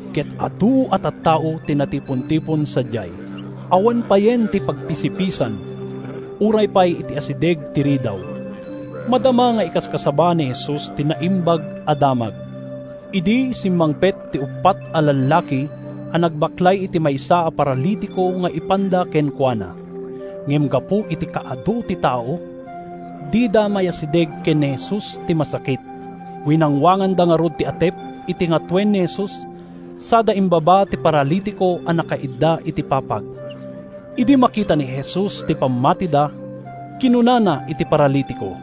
ket adu a tattao ti natipontipon sadiay. Awan payen ti pagpisipisan, uray pay iti asideg ti ridaw. Madama nga ikaskasaba ni Jesus ti Naimbag a Damag idi simmangpet ti uppat a lallaki a nagbaklay iti maysa a paralitiko nga ipanda kenkuana. Ngem gapu iti kaadu ti tao, dida mayasideg ken ni Jesus ti masakit. Winangwanganda ngarud ti atep iti ngatoen ni Jesus sada imbaba ti paralitiko a nakaidda iti papag. Idi makita ni Jesus ti pammatida, kinunana iti paralitiko,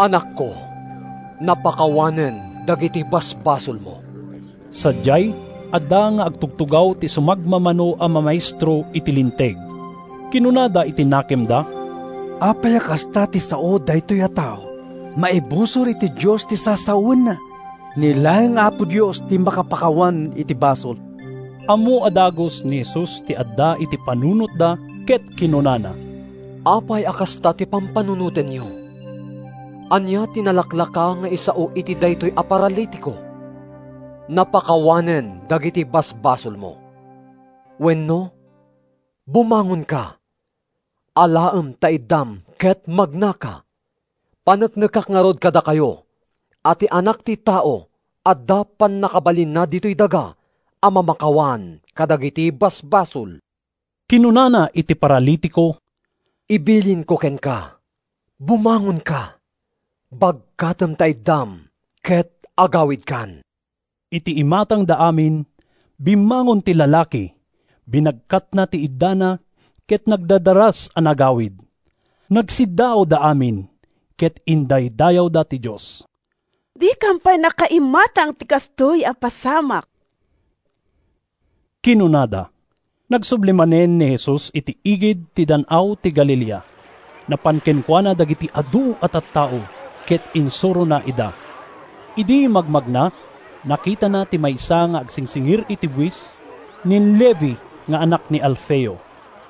“Anakko, napakawanen dagiti basbasolmo.” Sadiay, adda nga agtugtugaw ti sumagmamano a mamaestro iti Linteg. Kinunada iti nakemda, “Apay a kasta ti sao daytoy a tao? Maibusor iti Dios ti sasawenna! Ni laeng Apo Dios ti makapakawan iti basol!” Ammo a dagus ni Jesus ti adda iti panunotda ket kinunana, “Apay a kasta ti pampanunotenyo? Ania ti nalaklaka nga isao iti daytoy a paralitiko: ‘Napakawanen dagiti basbasolmo’ wenno ‘Bumangonka, alaem ta iddam ket magnaka’? Paneknekak ngarud kadakayo a ti Anak ti Tao adda pannakabalinna ditoy daga a mamakawan kadagiti basbasol.” Kinunana iti paralitiko, “Ibilinko kenka: bumangonka, bagkatem ta iddam ket agawidkan.” Iti imatangda amin, bimmangon ti lalaki, binagkatna ti iddana ket nagdardaras a nagawid. Nagsiddaawda amin, ket indaydayawda ti Dios. “Dikam pay nakaimatang iti kastoy a pasamak,” kinunada. Nagsubli manen ni Jesus iti igid ti Dan-aw ti Galilea. Napan kenkuana dagiti adu a tattao ket insurona ida. Idi magmagna, nakitana ti maysa nga agsingsingir iti buis, ni Levi nga anak ni Alfeo.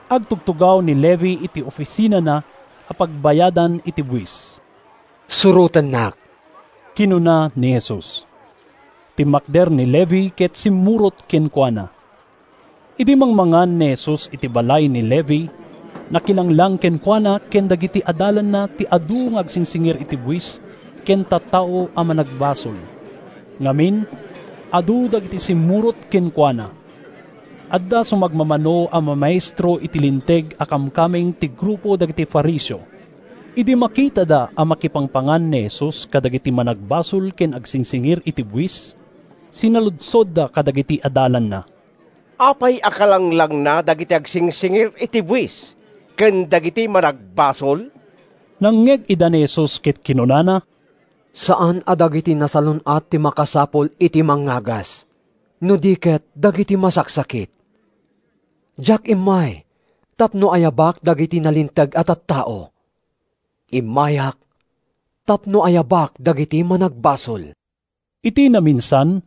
Agtugtugaw ni Levi iti ofisinana a pagbayadan iti buis. “Surotennak,” kinuna ni Jesus. Timmakder ni Levi ket simmurot kenkuana. Idi mangmangan ni Jesus iti balay ni Levi, nakilanglang kenkuana ken kadagiti adalanna ti adu nga agsingsingir iti buis ken tattao a managbasol. Ngamin, adu dagiti simmurot kenkuana. Adda sumagmamano a mamaestro iti Linteg a kamkameng ti grupo dagiti Fariseo. Idi makitada a makipangpangan ni Jesus kadagiti managbasol ken agsingsingir iti buis, sinaludsodda kadagiti adalanna, “Apay a kalanglangna dagiti agsingsingir iti buis ken dagiti managbasol?” Nangngeg ida ni Jesus ket kinunana: “Saan a dagiti nasalun-at ti makasapul iti mangngagas, no di ket dagiti masaksakit. Diak immay tapno ayabak dagiti nalinteg a tattao. Immayak tapno ayabak dagiti managbasol.” Iti naminsan,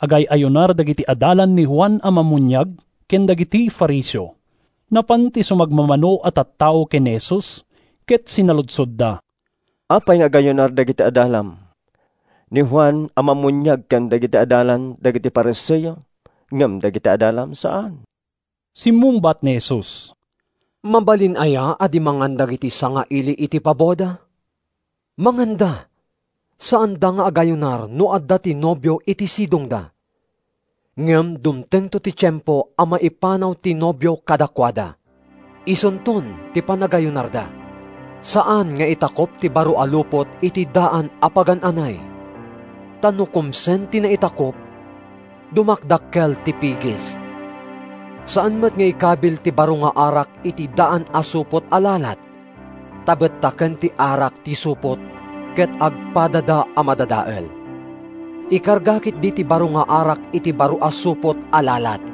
agay-ayunar dagiti adalan ni Juan a Mammuniag ken dagiti Fariseo. Napan ti sumagmamano a tattao ken ni Jesus ket sinaludsodda, “Apay nga agayunar dagiti adalan ni Juan a Mammuniag ken dagiti adalan dagiti Fariseo, ngem dagiti adalam saan?” Simmungbat ni Jesus, “Mabalin aya a di mangan dagiti sangaili iti paboda? Manganda! Saanda nga agayunar no adda ti nobio iti sidongda. Ngem dumtengto ti tiempo a maipanaw ti nobio kadakuada. Isunton ti panagayunarda. “Saan nga itakup ti baro a lupot iti daan a pagan-anay, ta no kumsen ti naitakup, dumakdakkel ti pigis. Saan met nga ikabil ti baro nga arak iti daan a supot a lalat, ta bettaken ti arak ti supot ket agpadada a madadael. Ikarga ketdi ti baro nga arak iti baro a supot a lalat!”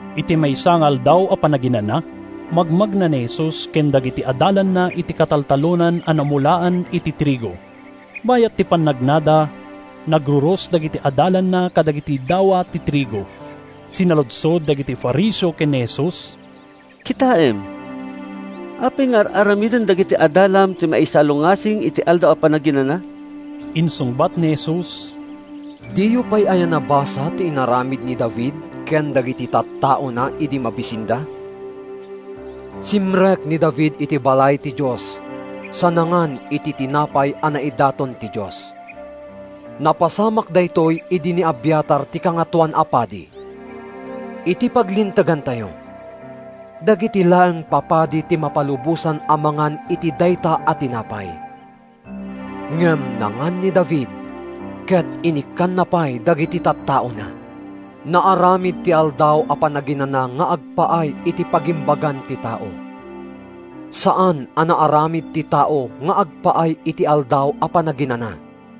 Iti maysa nga Aldaw a Panaginana, magmagna ni Jesus ken dagiti adalanna iti kataltalonan a namulaan iti trigo. Bayat ti pannagnada, nagruros dagiti adalanna kadagiti dawa ti trigo. Sinaludsod dagiti Fariseo ken ni Jesus, “Kitaem, apay nga ar-aramiden dagiti adalam ti maisalungasing iti Aldaw a Panaginana?” Insungbat ni Jesus, “Diyo pay aya nabasa ti inaramid ni David ken dagiti tattaona idi mabisinda? Simrek ni David iti balay ti Dios sa nangan iti tinapay a naidaton iti Dios. Napasamak daytoy idi ni Abiatar ti Kangatoan a Padi. Iti paglintegantayo, dagiti laeng papadi ti mapalubosan a mangan iti dayta a tinapay. Ngem nangan ni David ket inikkanna pay dagiti tattaona. “Naaramid ti Aldaw a Panaginana nga agpaay iti pagimbagan ti tao. Saan a naaramid ti tao nga agpaay iti Aldaw a Panaginana.